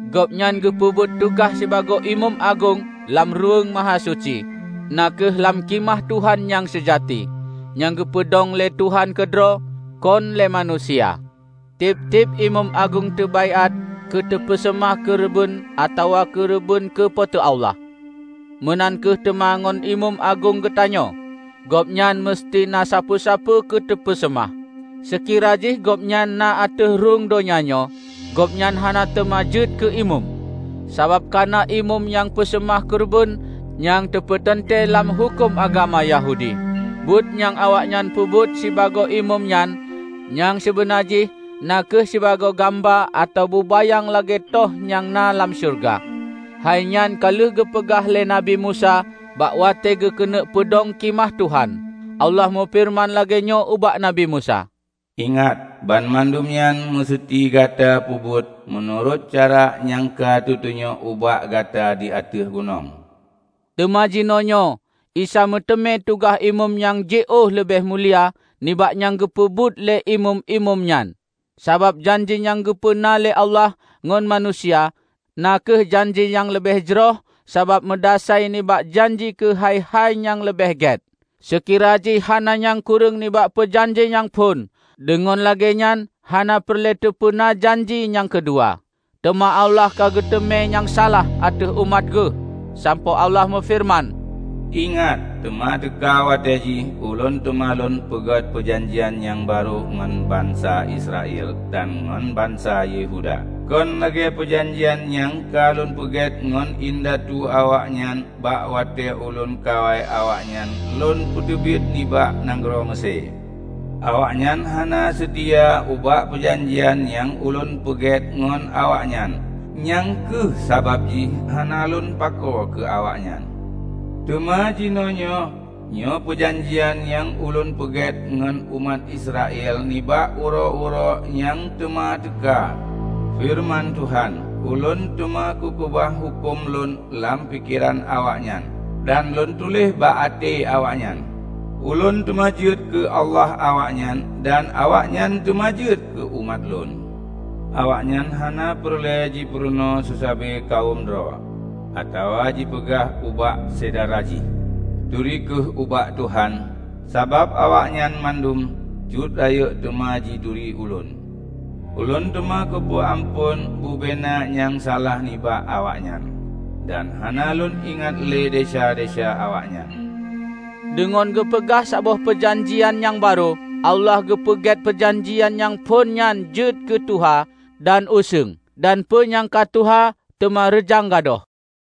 Gobnyan geupeubuet tugaih sibagoe Imeum Agong lam Ruweueng Mahasuci, na kheueh lam Khimah Tuhan nyang seujati, nyang geupeudong lé Tuhan keudroe, kon lé manusia. Tieb-tieb imeum agong teubaiát keu teupeuseumah keureubeuen atawa keureubeuen keu Po teu Allah. Meunan kheueh teuma ngon Imeum Agong geutanyoe; Gobnyan meuseuti na sapeue-sapeue keuteupeu seumah. Seukira jih Gobnyan na ateueh rhueng donya nyoe, Gobnyan hana teuma jeuet keu imeum, sabab kana imeum nyang peuseumah keureubeuen nyang teupeuteuntée lam huköm agama Yahudi. Buet nyang awaknyan peubuet sibagoe imeum nyan nyang sibeuna jih na kheueh sibagoe gamba atawa bubayang lagée toh nyang na lam syeuruga. Hai nyan ka lheueh geupeugah lé Nabi Musa bak watée geukeuneuk peudong Khimah Tuhan. Allah meufeureuman lagée nyoe ubak Nabi Musa, "Ingat! Banmandum nyan meuseuti gata peubuet meunurot cara nyang ka teutunyok ubak gata di ateueh gunong." Teuma jinoenyoe Isa meuteumé tugaih imeum nyang jiôh leubeh mulia nibak nyang geupeubuet lé imeum-imeum nyan. Sabab janji nyang geupeuna lé Allah ngon manusia, na kheueh janji nyang leubeh jroh sabab meudasai nibak janji keu hai-hai nyang leubeh gét. Seukira jih hana nyang kureueng nibak peujanji nyang phon, deungon lagée nyan hana peureulée teupeuna janji nyang keudua. Teuma Allah ka geuteumé nyang salah ateueh umat Geuh, sampoe Allah meufeureuman, "Ingat, teuma teuka watée jih, Ulôn teuma Lôn peugét peujanjian nyang barô ngon bansa Israel, dan ngon bansa Yehuda. Kon lagée peujanjian nyang ka Lôn peugét ngon indatu awaknyan bak watée Ulôn kawai awaknyan Lôn peuteubiet nibak nanggroe Meusé. Awaknyan hana seutia ubak peujanjian nyang Ulôn peugét ngon awaknyan; nyang kheueh sabab jih hana Lôn pakoe keu awaknyan. Teuma jinoenyoe, nyoe peujanjian nyang Ulôn peugét ngon umat Israel nibak uroe-uroe nyang teuma teuka, feureuman Tuhan: Ulôn teuma kukeubah huköm Lôn lam pikeran awaknyan, dan Lôn tuléh bak até awaknyan. Ulôn teuma jeuet keu Allah awaknyan, dan awaknyan teuma jeuet keu umat Lôn. Awaknyan hana peureulée jipurunoe seusabe kawöm droe, atawa jipeugah ubak syedara jih, 'Turi kheueh ubak Tuhan.' Sabab awaknyan mandum, cut rayeuk, teuma jituri Ulôn. Ulôn teuma kupeu amphon bubena nyang salah nibak awaknyan, dan hana Lôn ingat lé desya-desya awaknyan." Deungon geupeugah saboh peujanjian nyang barô, Allah geupeugét peujanjian nyang phon nyan jeuet keu tuha dan useueng; dan peue nyang ka tuha, teuma reujang gadôh.